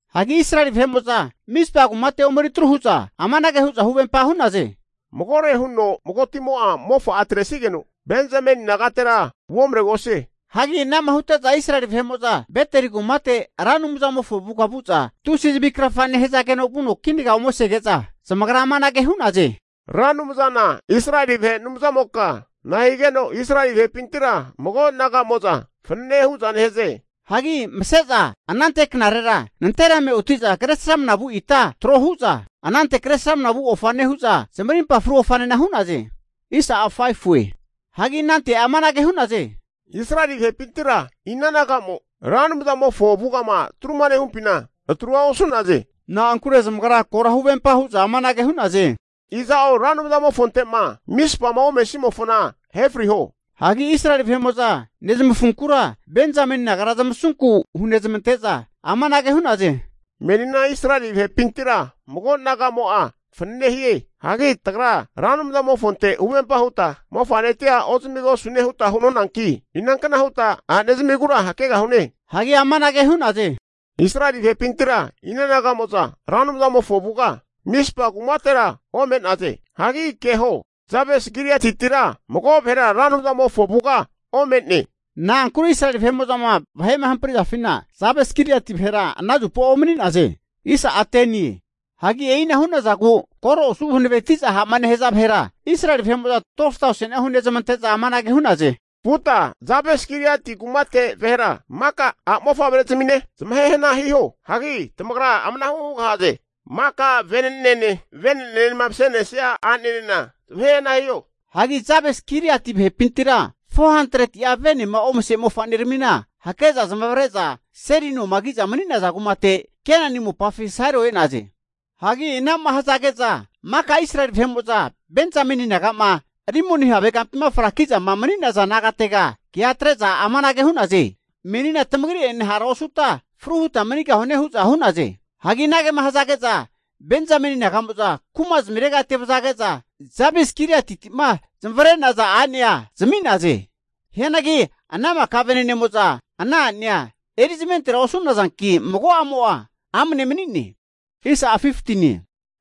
Hagi Israeli vahe'mo'za Mizpa kumate omeri atru hu'za amanage hu'za huvempa hu'naze, Magore huno magotimo'a mofa'a atresigeno Benzameni nagatera uomaregosie. Hagi ana'ma hute'za Israeli vahe'mo'za Beteli kumate Ra Anumzamofo avuga vu'za tusi zavi krafa nehazageno vuno kinaga omesege'za, zamagra amanage hu'naze, Ra Anumzana Israeli vahe Anumzamoka nahigeno Israeli vahepintira mago naga'mo'za fananea hu'za nehaze? Hagi mase'za anante knarera nanterame oti'za kresramna vu ita trohu'za, anante kresramnama vu ofa nehu'za, zamarimpa fru ofanena hu'naze. Hagi anante amanage hu'naze, Israeli vahepintira ina naga'mo Ra Anumzamofo avugama atruma nehumpina atrua osu'naze? Na'ankure zamagra kora huvempa hu'za amanage hu'naze, Iza'o Ra Anumzamofonte'ma Mispama omesimofona ahe friho. Hagi Israeli vahe'mo'za nezamafunkura Benzameni nagara zamasunku hunezamante'za amanage hu'naze, menina Israeli vahepintira mago nagamo'a fanane hie. Hagi tagra Ra Anumzamofonte huvempa huta mofa'netia ozamigosune huta hunonanki, inankna huta a'ne zamigura hakegahune? Hagi amanage hu'naze, Israeli vahepintira ina naga'mo'za Ra Anumzamofo avuga Mispa kumatera ome'naze? Hagi keho Jabes-Gileatitira mago vahera Ra Anumzamofo avuga ome'ne. Na'ankure Israeli vahe'mo'zama vahe'ma hamprizafina Jabes-Giliati vahera ana zupa omani'naze. Hagi e'ina hu'nazagu koro osu'za hanaveti'za ha'ma nehaza vahera, Israeli vahe'mo'za 12tauseni'a hunezamante'za amanage hu'naze, vuta Jabes-Giliati kumate vahera maka a' mofavre'zamine zamahe hana hiho. Hagi tamagra amanahu hugahaze, maka vene'nene, vene'nenema mase'nesia a'nenena zamahehna hiho. Hagi Jabes-Gileati vahepintira 400'a venema omase mofa'neramina hake'za zamavare'za seli noma ki'za mani'naza kumate Kenani mopafi Sailo e'naze. Hagi ana'ma hazage'za maka Israeli vahe'mo'za Benzameni naga'ma Rimoni havekampima fraki'zama mani'naza nagatega kea atre'za amanage hu'naze, Menina tamagri'enena hara osuta fru huta manigahune hu'za hu'naze. Hagi anagema hazage'za Benzameni naga'mo'za kuma'zmirega ete vazage'za Jabes-Giliatiti'ma zmavre'naza a'nea zami'naze. Hianagi ana maka vene'nemo'za ana a'nea erizamentera osu'nazanki mago'amo'a amne mani'ne.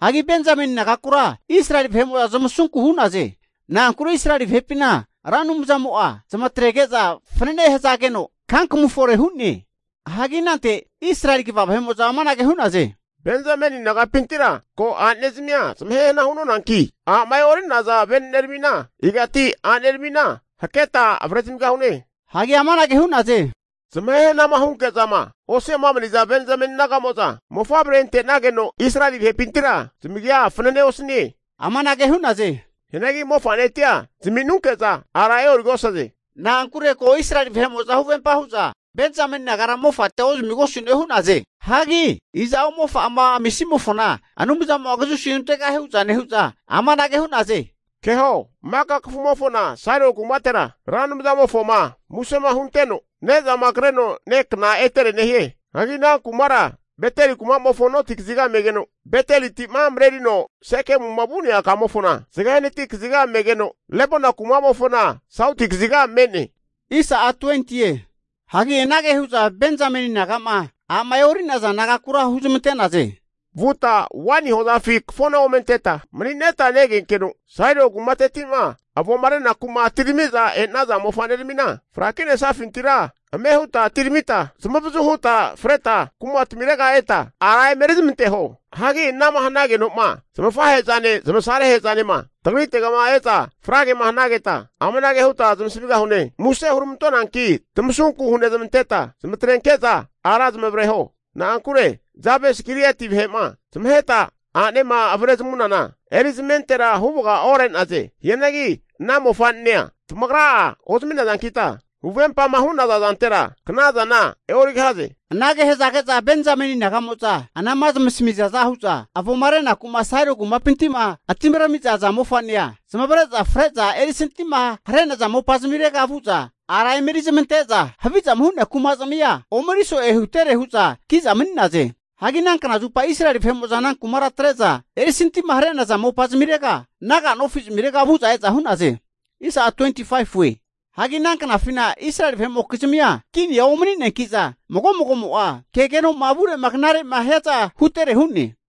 Hagi Benzameni nagakura Israeli vahe'mo'za zamasunku hu'naze. Na'ankure Israeli vahepina Ra Anumzamo'a zamatrege'za fanane hazageno kankamu fore hu'ne. Hagi anante Israeli kva vahe'mo'za amanage hu'naze, Benzameni nagapintira ko a'nezmia zamahe hana hu'nonanki, a'ma e'ori'naza vene'neramina igati a'neramina haketa avrezamigahune? Hagi amanage hu'naze, Zamahe hanama hunke'zama osi'ama maniza Benjamen naga'mo'za mofavre ante'nageno Israeli vahepintira zamagia fanane osanie. Hianagi mofa'netia zaminunke'za ara e'origosaze. Na'ankure ko Israeli vahe'mo'za huvempa hu'za Benzameni nagara mofatia ozamigosune hu'naze. Hagi iza'oma mofa'ama amisimofona Anumzamo'a kazusi huntegahie hu'za nehu'za, amanage hu'naze, Keho maka kafumofona Sailo kumatera Ra Anumzamofoma musema hunteno ne'zama kreno nekna etere nehie. Hagi ana kumara Beteli kuma'mofo noti kaziga megeno, Betelitima marerino Sekemuma vu'nea kamofona zage hanati kaziga megeno, Lebona kuma'mofona sauti kaziga me'ne. Hagi anage hu'za Benzameni naga'ma a'ma e'ori'naza nagakura huzmante'naze, Vuta waini hozafi kafona ome anteta, mani'neta negenkeno Sailo kumateti'ma avoma renaku'ma atirami'za e'naza mofa'neramina fraki'nesafintira ame huta atiramita zamavazu huta freta kumatmirega eta ara emeri zamanteho. Hagi anama hanageno'ma zamafahe'zane zamaserahe'zanema tagrite'ma e'za fragema hanageta, amanage huta zamasamigahune. Muse huramantonanki tamasunku hunezamanteta zamatrenke'za ara zamavareho. Na'ankure Jabes-Giliati vahe'ma zamaheta a'nema avre zamunana erizamentera huvaga ore'naze. Hianagi ana mofa'nea tamagra'a ozami'nazankita huvempama hu'naza zantera knazana e'origahaze. Anage hazage'za Benjamen naga'mo'za anama zamasamizaza hu'za avoma renakuma Sailo kumapinti'ma atirami'za aza mofa'nea zamavare'za fre'za erisantima hare'naza mopazmirega vu'za ara omeri zamante'za havizama hu'nea kumazmia omeri so'e hutere hu'za ki'za mani'naze. Hagi ana knazupa Israeli vahe'mo'za ana kumara atre'za erisantima hare'naza mopazmirega, naga nofi zamirega vu'za e'za hu'naze. Hagi ana knafina Israeli vahe'mokizmia kinia omani'neanki'za, mago'mago'mo'a kegeno'ma avure'ma knare'ma hiazana hutere hu'ne.